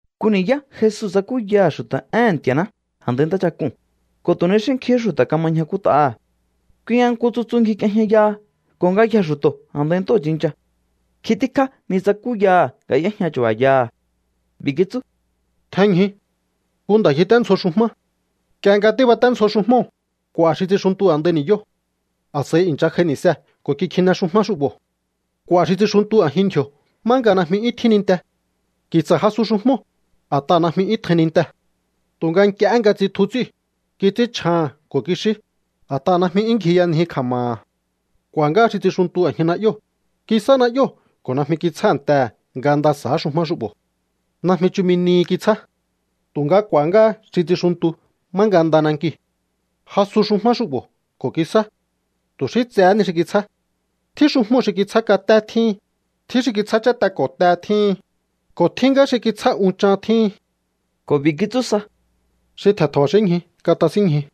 Nku ni̱yá Jesu tsakúyaha̱ xu̱ta̱ éhe̱n Nti̱a̱ná a̱ndai ntáchak'uu̱n, ko̱ tu̱ ni xí nkjihín xu̱ta̱ kama ñjakút'aha̱. Kui nga nku tsutsu ngjik'iejñayaha ko̱ ngayjee̱ xu̱to̱ a̱ndai ntóo̱ tsincha. Nkjin tíkjá ni tsakúyaha̱ nga y'éjña chu̱ba̱yaha̱. B'i̱ kitsú: —Tjenñju. Nku nda̱ ngjiténdzjo xujmá. Nk'ie nga tíbaténdzjo xujmóo̱, k'u̱a̱ xi tsixuntu a̱ndai ni̱yóo̱. A̱s'a̱i i̱ncha j'ai ni̱see̱ ko̱ kikjine xujmá xu'bo̱. K'u̱a̱ xi tsixuntu a̱jin ndji̱o̱ má nga najmi 'yún tjín ninte. Ki̱tsa̱ jasu xujmóo̱, a̱t'aha̱ najmi 'yún tjain nintee̱. Tu̱nga nk'iehé nga tsitju ts'íu̱, kits'ínchjaha̱n ko̱ kixí, a̱t'aha̱ najmi 'yún ngjiyanji kja̱ma̱ha̱. K'u̱a̱ ngá xi tsixuntu a̱jin na'yóo̱. Kisá na'yóo̱ ko̱ najmi kitsjántehe̱ nga nda sa̱á xujmá xu'bo̱. Najmi chumi nihi kitsjá. Tu̱nga k'u̱a̱há ngá xi tsixuntu má nga nda nankiu̱. Jasu xujmá xu'bo̱ ko̱ kisá. Tu̱ xí tsehé ni xi kitsjá. Tjín xujmóo̱ xi kitsjá katé tjíhin, tjín xi kitsjá cháte ko̱ te tjíhin, ko̱ tjín ngá xi kitsjá unchan tjíhin. Ko̱ b'i̱ kitsú sa: —Xi tje̱n tja̱ba̱xínñju, katasínñju.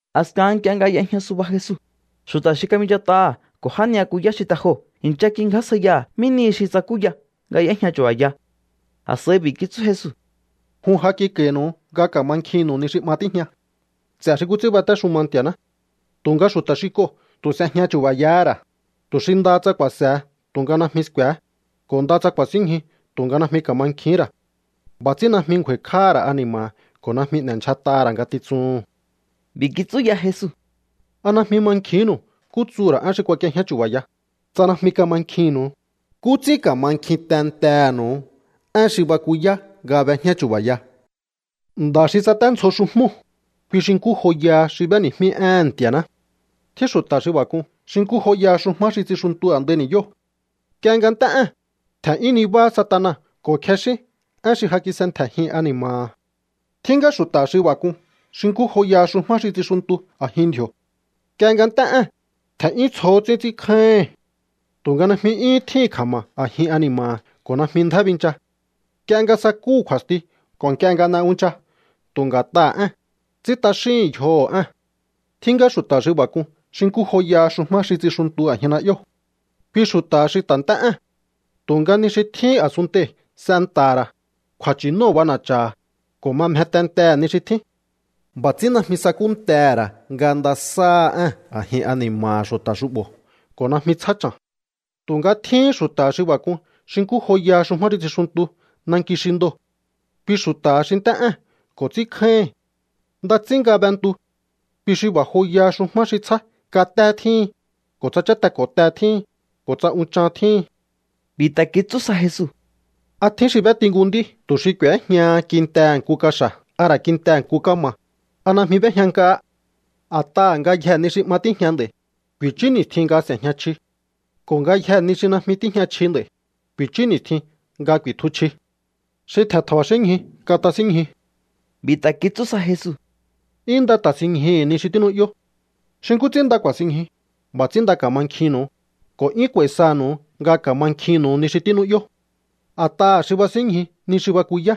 A̱skahan nk'ie nga y'ejña suba Jesu, xu̱ta̱ xi kabinchat'aha̱ ko̱ já ni'yakuyá xi te joo̱ i̱ncha kingjásjaiyaha̱ mí nihi xi tsakúya nga y'éjña chu̱ba̱ya. A̱s'a̱i b'i̱ kitsú Jesu: —Jun ja kik'a̱i̱nu̱u nga ka̱mankjinnu̱u ni xi 'ma tíjña ts'e̱ xi nkú ts'ín batéxuma Nti̱a̱ná. Tu̱nga xu̱ta̱ xi k'oo̱ tu̱ s'ejña chu̱ba̱yahá ra̱, tu̱ xi ndaha tsa ku̱a̱se̱he tu̱nga najmi sku̱e̱hé, ko̱ ndaha tsa ku̱a̱sínñju tu̱nga najmi ka̱mankjihín ra̱. B'a̱ ts'ín najmi ngju̱a̱i̱kj'áha̱ ra̱ ani̱ma̱ha̱ ko̱ najmi n'e̱ndyjat'aha̱ ra̱ ngatitsuhu̱n. B'i̱ kitsú ya Jesu: —¿A najmi mankjinnu̱u nkú tsuhu̱ ra̱ én xi kuak'iejñá chu̱ba̱ya? Tsa najmi kamankjinnu̱u, ¿nkú ts'ín ka̱mankjin tentehe̱nu̱u én xi bakuyá nga b'ejñá chu̱ba̱ya? ’Nda̱ xi tsaténdzjo xujmóo̱, kui xi nkú joyaha xi b'éni̱jmí éhe̱n Nti̱a̱ná. Tjín xu̱ta̱ xi b'a̱ k'un xi nkú joyaha xujmá xi tsixuntu a̱ndai ni̱yóo̱. Nk'ie nga nt'é ée̱n, tje̱n'yún nibáhá Satana ko̱ kjexín én xi ja kis'entje̱jin ani̱ma̱ha̱. ’Tjín ngá xu̱ta̱ xi b'a̱ k'un xi nkú joyaha xujmá xi tsixuntu a̱jin ndji̱o̱. Nk'ie nga nt'é ée̱n, tje̱n'yún tsjohó ts'ín ts'ínkjáíhi̱n. Tu̱nga najmi 'yúhún tjíhi̱n kja̱ma̱ a̱jin ani̱ma̱ha̱ ko̱ najmi ndjá bincha. Nk'ie nga sakúhu̱ kju̱a̱sti ko̱ nk'ie nga n'e uncha tu̱ nga̱t'aha̱ ée̱n, ts'ín t'axíhi̱n yjoho̱ ée̱n. ’Tjín ngá xu̱ta̱ xi b'a̱ k'un xi nkú joyaha xujmá xi tsixuntu a̱jin na'yóo̱. Kui xu̱ta̱ha xi ta̱ nt'é ée̱n, tu̱nga ni xi tjíhín a̱sunntei̱ s'enta̱ha̱ ra̱, kju̱a̱nchi̱nóo̱ b'ana̱cha̱ha̱, ko̱ ma mje tentehe̱ ni xi tjín. B'a̱ ts'ín najmi sakúntehe̱ ra̱ nga nda sa̱áha ée̱n a̱jin ani̱ma̱ha̱ xu̱ta̱ xu'bo̱ ko̱ najmi tsjá cha̱n. ’Tu̱nga tjíhín xu̱ta̱ xi b'a̱ k'un xi nkú joyaha xujmá xi tsixuntu nanki xi ndoo̱. Kui xu̱ta̱ha xi nt'é ée̱n ko̱ ts'ínkjáíhi̱n. Nda ts'ín nga b'entu. Kui xi b'a̱ joyaha xujmá xi tsjá katé tjíhin, ko̱ tsa cháte ko̱ te tjíhin, ko̱ tsa unchan tjíhin. B'i̱ ta̱ kitsú sa Jesu: —¿A tjín xi b'éti nku nd'í tu̱ xi k'u̱éjñaha kintehe̱ nku kaxa̱ a ra̱ kintehe̱ nku kama̱? ¿A najmi b'éjña nk'ahá? A̱t'aha̱ ngayjee̱ ni xi 'ma tíjña nd'a̱i̱, ku̱i̱chú ni̱stjin nga s'e̱jña chji. Ko̱ ngayjee̱ ni xi najmi tíjña chji nd'a̱i̱, ku̱i̱chú ni̱stjin nga ku̱i̱tju chji. Xi tje̱n tja̱ba̱xínñju, katasínñju. B'i̱ ta̱ kitsú sa Jesu: —'Yún nda ta̱sinñjuhu̱u ni xi tínu'yó. Xi nkú ts'ín nda ku̱a̱sinñju, b'a̱ ts'ín nda ka̱mankjinnu̱u, ko̱ 'yún k'u̱a̱i̱ sanu̱u nga ka̱mankjinnu̱u ni xi tínu'yó. A̱t'aha̱ xi ba̱sínñju ni xi bakuyá,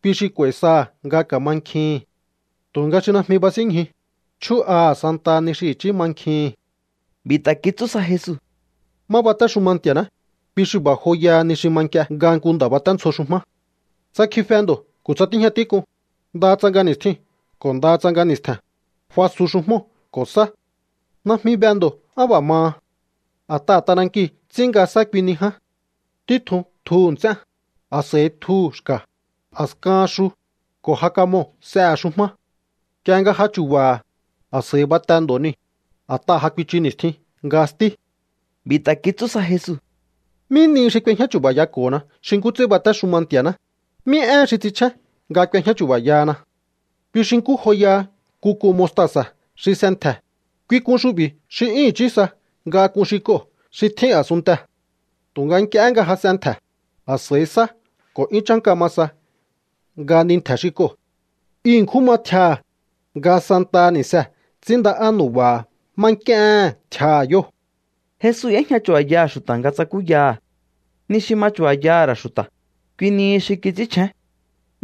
kui xi k'u̱a̱i̱ saha̱ nga ka̱mankjihi̱n. Tu̱nga xi najmi ba̱sínñju, chjú'aha̱ santaha ni xi i̱chí mankjihi̱n. B'i̱ ta̱ kitsú sa Jesu: —Má batéxuma Nti̱a̱ná, kui xi b'a̱ joyaha ni xi ma nk'ie nga nku nda̱ baténdzjo xujmá. Tsa kjife ndo̱ ko̱ tsa tíjña tík'un, ndaha tsa nga ni̱stjiu̱n ko̱ ndaha tsa nga ni̱stje̱n, fasu xujmóo̱ ko̱ sá. Najmi be ndo̱ á b'a̱ maha. A̱t'aha̱ t'anankiu̱ ts'ín nga sá kui ni ján. Títjun tjuhu̱ nts'én, a̱s'a̱i tjuhu̱ xka̱, a̱skahan xu, ko̱ ja kamoo̱ s'ehe̱ xujmá. Nk'ie nga ja chu̱ba̱ha̱, a̱s'a̱i bate ndo̱ niu̱, a̱t'aha̱ ja kuichu ni̱stjin nga stí. B'i̱ ta̱ kitsú sa Jesu: —¿Mí nihi xi k'uejñá chu̱ba̱yako̱hona xi nkú ts'ín batéxuma Nti̱a̱ná? ¿Mí éhen xi ts'inchjén nga k'uejñá chu̱ba̱yahana? Kui xi nkú joyaha nku k'un mostasa̱ xi s'entje̱. Kui k'un xu'bi̱ xi 'yún i̱chí sa nga k'un xi k'oo̱ xi tjín a̱sunntee̱. Tu̱nga nk'iehé nga ja s'entje̱, a̱s'a̱i sá ko̱ 'yún chánka ma sa nga ni ntje̱ xi k'oo̱. I ṉkjún ma tjiaha̱, nga santaha ni̱see̱ ts'ínnda'á nu̱ba̱ha̱ má nk'íéhe̱n tjiaha̱ yóo̱. Jesu y'éjña chu̱ba̱yaha̱ xu̱ta̱ nga tsakúyaha̱. Ni xi ma chu̱ba̱yaha̱ ra̱ xu̱ta̱, kui nihi xi kits'ínchjén.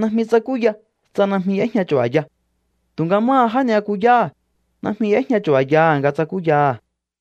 Najmi tsakúya tsa najmi y'éjña chu̱ba̱ya. Tu̱nga máha já ni'yakuyáha̱, najmi y'éjña chu̱ba̱yaha̱ nga tsakúyaha̱.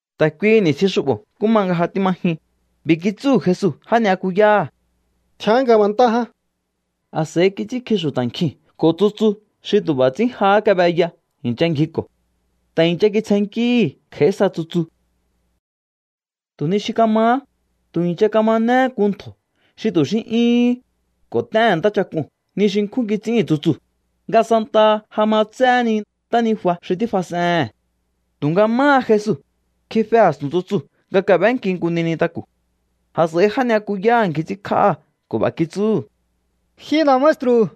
Ta̱ kuihi ni̱stjin xu'bo̱ nkú ma nga ja tíma jyun, b'i̱ kitsúhu̱ Jesu já ni'yakuyáha̱: —Tjián ngabantá ján. A̱s'a̱i kits'ínkji xu̱ta̱ nkjiu̱n ko̱ tsutsu xi tu̱ b'a̱ ts'ín jahá kab'eya i̱ncha ngjiko̱. Ta̱ i̱ncha kitsjennkíhi̱ kj'a̱í sa tsutsu. Tu̱ ni xi kamahá, tu̱ i̱ncha kamanehé nku ntjo̱ xi tu̱ xí 'yúhún, ko̱ t'éhe̱n ntáchak'uu̱n ni xi nkjún kits'íhi̱n tsutsuu̱, nga santaha ja ma tséhé ni ntánijua xi tífas'ehe̱n. Tu̱nga máha Jesu, kjife a̱stu̱n tsutsuu̱ nga kab'énki nku ni nintaku̱. A̱s'a̱i já ni'yakuyáha̱ ngji ts'ínkj'áha̱ ko̱ b'a̱ kitsúhu̱: —Ji nda̱ maestru̱,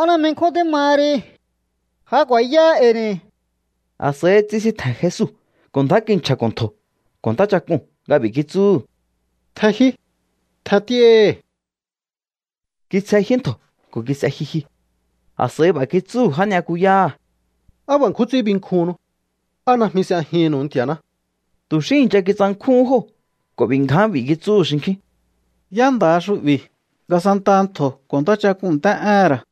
¿á najmi nkjún tímaha ri? ¡Ja ku̱a̱yáá e̱i̱ ni̱! A̱s'a̱i tsisintje̱n Jesu ko̱ ndjá kinchja̱ko̱ ntjo̱ ko̱ ntáchak'uu̱n nga b'i̱ kitsúhu̱: —¡Tjenjyúí! ¡Tjent'íáhi̱! Kitsjenjyú ntjo̱ ko̱ kis'e jyujyu. A̱s'a̱i b'a̱ kitsúhu̱ já ni'yakuyáha̱: —¿Á b'a̱ nkjún ts'ín binkjuhunnu? ¿Á najmi s'ejihi̱nnu̱u Nti̱a̱ná? Tu̱ xí i̱ncha kitsankjúhún jóo̱ ko̱ b'i̱ ngján b'i̱ kitsúhu̱ xinkjín: —¿Yá nda̱ha xu'bi̱ nga santaha ntjo̱ ko̱ ntáchak'uu̱n nt'é'éhe̱n ra̱?